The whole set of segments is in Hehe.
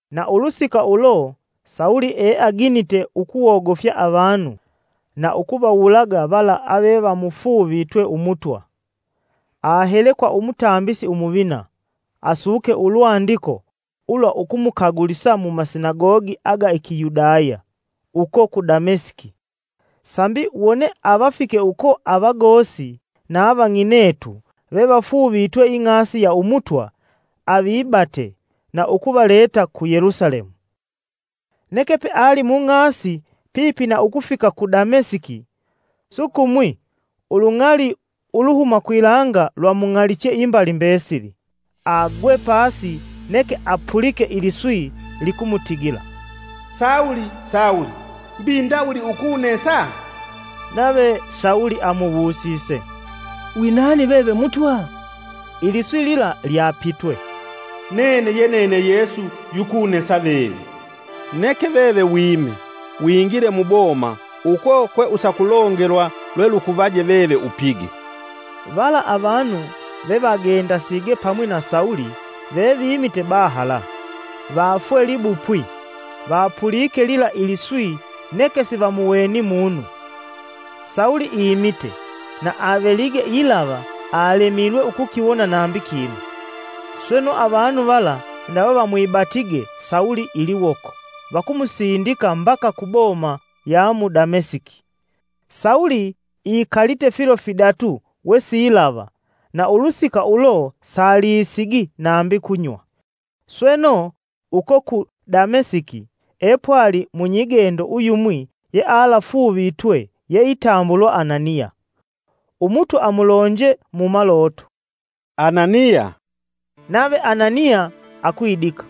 Na ulusika ulo Sawulo eaginite ukuwogofya avanu nu nukutosa ukuvawulaga vala avevamufuuvitwe Umutwa. Ahele kwa Umutambisi Umuvina asuke ulwandiko ulwa ukumukagulisa mumasinagogi aga Ikiyudaya uko ku Damesiki, sambi wone avafike uko avagosi na avang'inetu vevafuuvitwe ing'asi ya umutwa avibate na ukuvaleta ku Yelusalemu. Neke peali mung'asi pipi na ukufika ku Damesiki, sukumwi ulung'ali uluhuma kwilanga lwamung'aliche imbali mbesili. Agwe pasi neke apulike iliswi likumutigila, “Sawulo! Sawulo, mbi ndawuli ukunesa?” Nave Sawulo amuwusise, “Wi nani veve Mutwa?” Iliswi lila lyapitwe, “Nene ye nene Yesu yukunesa veve. Neke veve wime, wingile muboma uko kwe usakulongelwa lwelukuvaje veve upige.” Vala avanu vevagendasige pamwinga na Sawulo vevimite bahala, vafwe libupwi; vapulike lila iliswi neke sivamuweni munu. Sawulo imite, na avelige ilava alemilwe ukukiwona nambi kinu; sweno, avanu vala ndawe vamwibatige Sawulo iliwoko vakumusindika mbaka ku boma ya mu Damesiki. Sawulo ikalite filo fidatu wesilava, na ulusika ulo salisigi nambi kunywa. Sweno, uko ku Damesiki epwali munyigendo uyumwi yealafuuvitwe yeitambulwa Ananiya. Umutwa amulonje mu maloto, “Ananiya!” Nave Ananiya akwidika,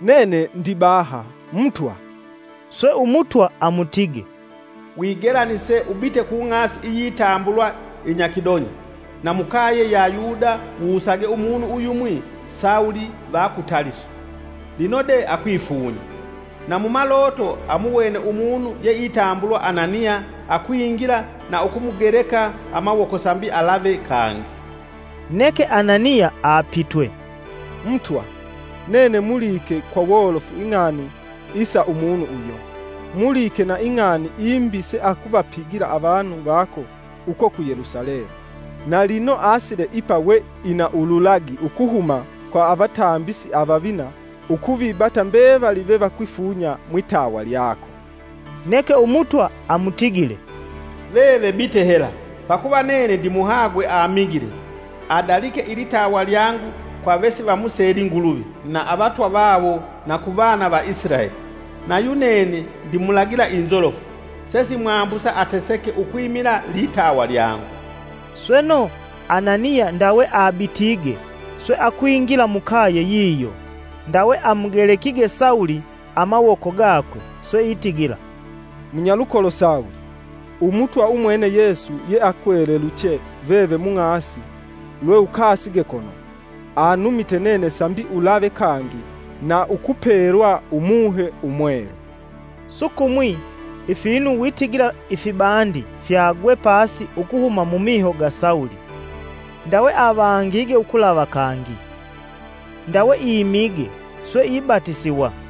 “Nene ndibaha, Mutwa.” Swe Umutwa amutige, “Wigelanise ubite ku ng'asi iyitambulwa inyakidonya, na mukaye ya Yuda wusage umunu uyumwi Sawulo va ku Taliso. Lino de akwifunya. Na mumaloto amuwene umunu yeitambulwa Ananiya akwingila na ukumugeleka amawoko sambi alave kangi.” Neke Ananiya apitwe, “Mutwa, nene mulike kwa wolofu ing'ani isa umunu uyo; mulike na ing'ani imbi seakuvapigila avanu vako uko ku Yelusalemu. Na lino asile ipa we ina ululagi ukuhuma kwa Avatambisi avavina ukuvibata mbevali vevakwifunya mwitawa lyako.” Neke umutwa amutigile, “Veve bite hela, pakuva nene ndimuhagwe amigile, adalike ilitawa lyangu kwa vesivamuseli Nguluvi (avamyanza) na avatwa vawo na kuvana va Isilaeli. Na yunene ndimulagila inzolofu, sesimwambusa ateseke ukwimila litawa lyangu.” Sweno, Ananiya ndawe abitige, swe akwingila mukaye yiyo. Ndawe amugelekige Sawulo amawoko gakwe swe itigila, “Munyalukolo Sawulo, Umutwa umwene Yesu yeakweleluche veve mung'asi lweukasige kono, anumite nene sambi ulave kangi na ukupelwa Umuhe Umwelu.” Sukumwi ifinu witigila ifibandi fyagwe pasi ukuhuma mumiho ga Sawulo, ndawe avangige ukulava kangi. Ndawe imige, swe ibatisiwa.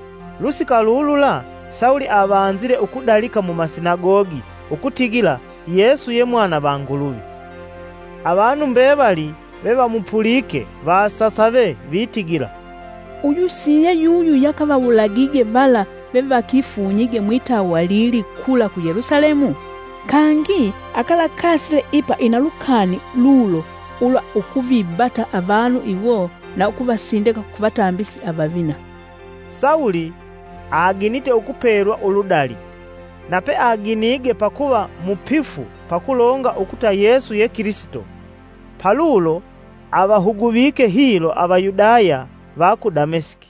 Lusika lulula Sawulo avanzile ukudalika mumasinagogi ukutigila Yesu ye Mwana va Nguluvi. Avanu mbevali vevamupulike vasasave, vitigila, “Uyu si ye yuyu yakavawulagige vala vevakifunyige mwitawa lili kula ku Yelusalemu? Kangi akalakasile ipa ina lukani lulo ulwa ukuvibata avanu iwo na ukuvasindika ku vatambisi avavina!” Sawulo aginite ukupelwa uludali, na pe aginige pakuva mupifu pa kulonga ukuta Yesu ye Kilisito, palulo avahuguvike hilo Avayudaya va ku Damesiki.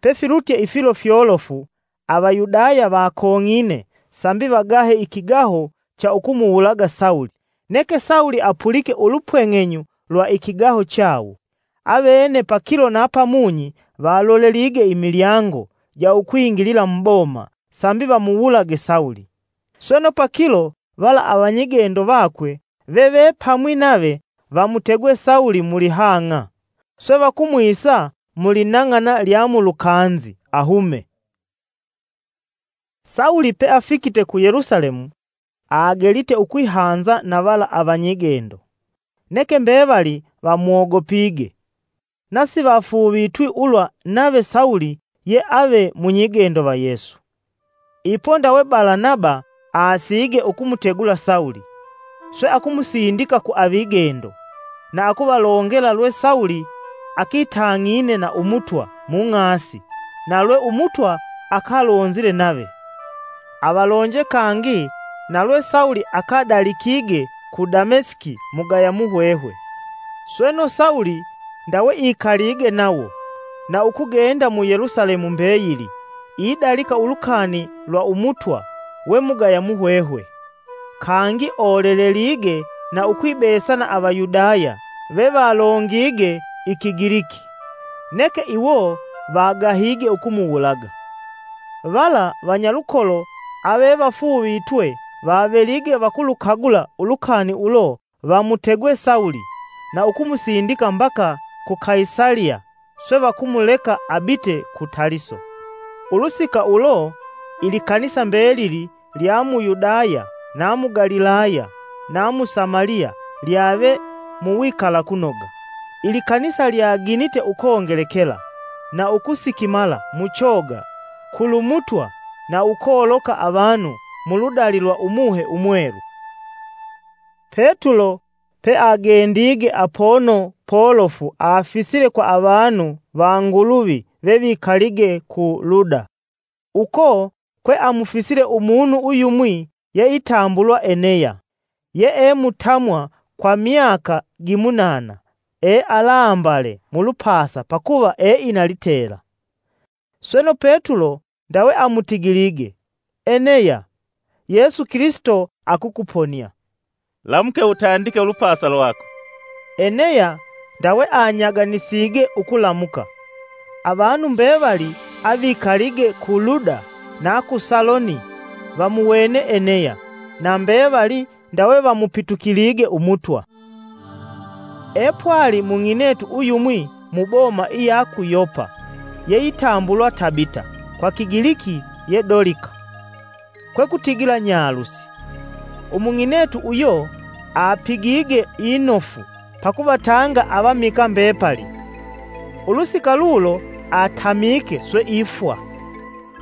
Pefilutye ifilo fyolofu, Avayudaya vakong'ine sambi vagahe ikigaho cha ukumuwulaga Sawulo. Neke Sawulo apulike ulupweng'enyu lwa ikigaho chawo. Avene pakilo na pamunyi valolelige imilyango ja ukwingilila muboma sambi vamuwulage Sawulo. Sweno pakilo vala avanyigendo vakwe vevepamwi nave, vamutegwe Sawulo mulihang'a, swe vakumwisa mulinang'ana lya mulukanzi ahume. Sawulo peafikite ku Yelusalemu agelite ukwihanza na vala avanyigendo. Neke mbevali vamwogopige, na sivafuuvitwi ulwa nave Sawulo ye ave munyigendo va Yesu. Ipo, ndawe Balanaba asige ukumutegula Sawulo, swe akumusindika ku avigendo na ukuvalongela lwe Sawulo akitang'ine na Umutwa mung'asi na lwe Umutwa akalonzile nave. Avalonje kangi na lwe Sawulo akadalikige ku Damesiki mugaya muhwehwe. Sweno, Sawulo ndawe ikalige nawo, na ukugenda mu Yelusalemu mbeyili idalika ulukani lwa Umutwa we mugaya muhwehwe. Kangi, olelelige na ukwibesa na Avayudaya vevalongige Ikigiliki, neke iwo vagahige ukumuwulaga. Vala vanyalukolo avevafuuvitwe vavelige vakulukagula ulukani ulo, vamutegwe Sawulo, na ukumsindika mbaka ku Kaisaliya swe vakumuleka abite ku Taliso. Ulusika ulo ilikanisa mbelili lya mu Yudaya, na mu Galilaya na mu Samaliya lyave muwikalakunoga. Ilikanisa lyaginite ukongelekela na ukusikimala mu choga kulu Mutwa na ukoloka avanu mu ludali lwa Umuhe Umwelu. Petulo peagendige apono polofu afisile kwa avanu va Nguluvi vevikalige ku Luda. Uko kweamufisile umunu uyumwi yeitambulwa Eneya yeemutamwa kwa myaka gimunana ealambale mulupasa pakuva eina litela. Sweno, Petulo ndawe amutigilige, Eneya, Yesu Kilisito akukuponia. “Lamuke utandike ulupasa lwako.” Eneya ndawe anyaganisige ukulamuka. Avanu mbevali avikalige ku Luda na ku Saloni vamuwene Eneya, na mbevali ndawe vamupitukilige Umutwa. Petulo akumuponia Dolika. Epwali mung'inetu uyumwi muboma iya ku Yopa yeitambulwa Tabita (kwa Kigiliki ye Dolika, kwekutigila, Nyalusi). Umung'inetu uyo apigige inofu pakuvatanga avamikaa mbepali. Ulusika ulo atamike swe ifwa.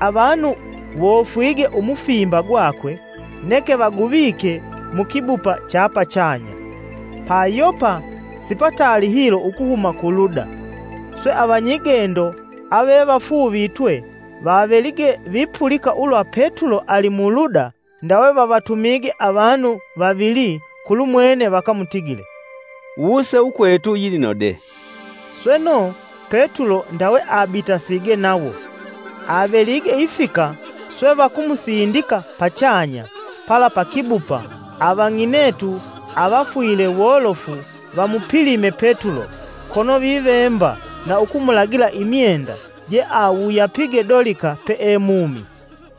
Avanu wofwige umufimba gwakwe, neke vaguvike mukibupa cha pachanya. Pa Yopa sipataali hilo ukuhuma ku Luda; swe avanyigendo avevafuuvitwe vavelige vipulika ulwa Petulo ali mu Luda, ndawe vavatumige avanu vavili kulumwene vakamutigile; “Wuse ukwetu yilino de.” Sweno, Petulo ndawe abitasige nawo. Avelige ifika swe vakumusindika pachanya pala pa kibupa avang'inetu avafwile wolofu vamupilime Petulo kono vivemba na ukumulagila imyenda jeawuyapige Dolika peemumi.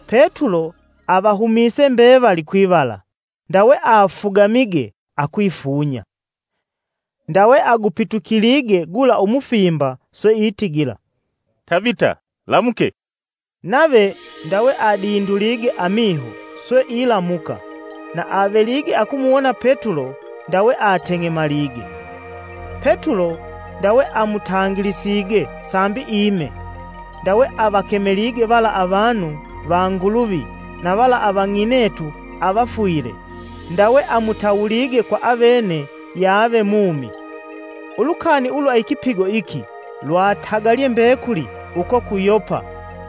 Petulo avahumise mbevali kwivala, ndawe afugamige akwifunya. Ndawe agupitulige gula umufimba swe itigila, “Tabita lamuke.” Nave ndawe adindulige amiho swe ilamuka, na avelige akumuwona Petulo, ndawe ateng'emalige. Petulo ndawe amutangilisige sambi ime, ndawe avakemelige vala avanu va Nguluvi na vala avang'inetu avafwile, ndawe amutawulige kwa avene yave mumi. Ulukani ulwa ikipigo iki lwatagalye mbekuli uko ku Yopa,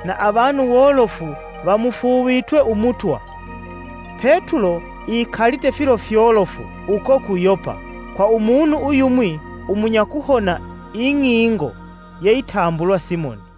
na avanu wolofu vamufuuvitwe Umutwa. Petulo ikalite filo fyolofu uko ku Yopa, kwa umunu uyumwi umunyakuhona ing'ingo yeitambulwa Simoni.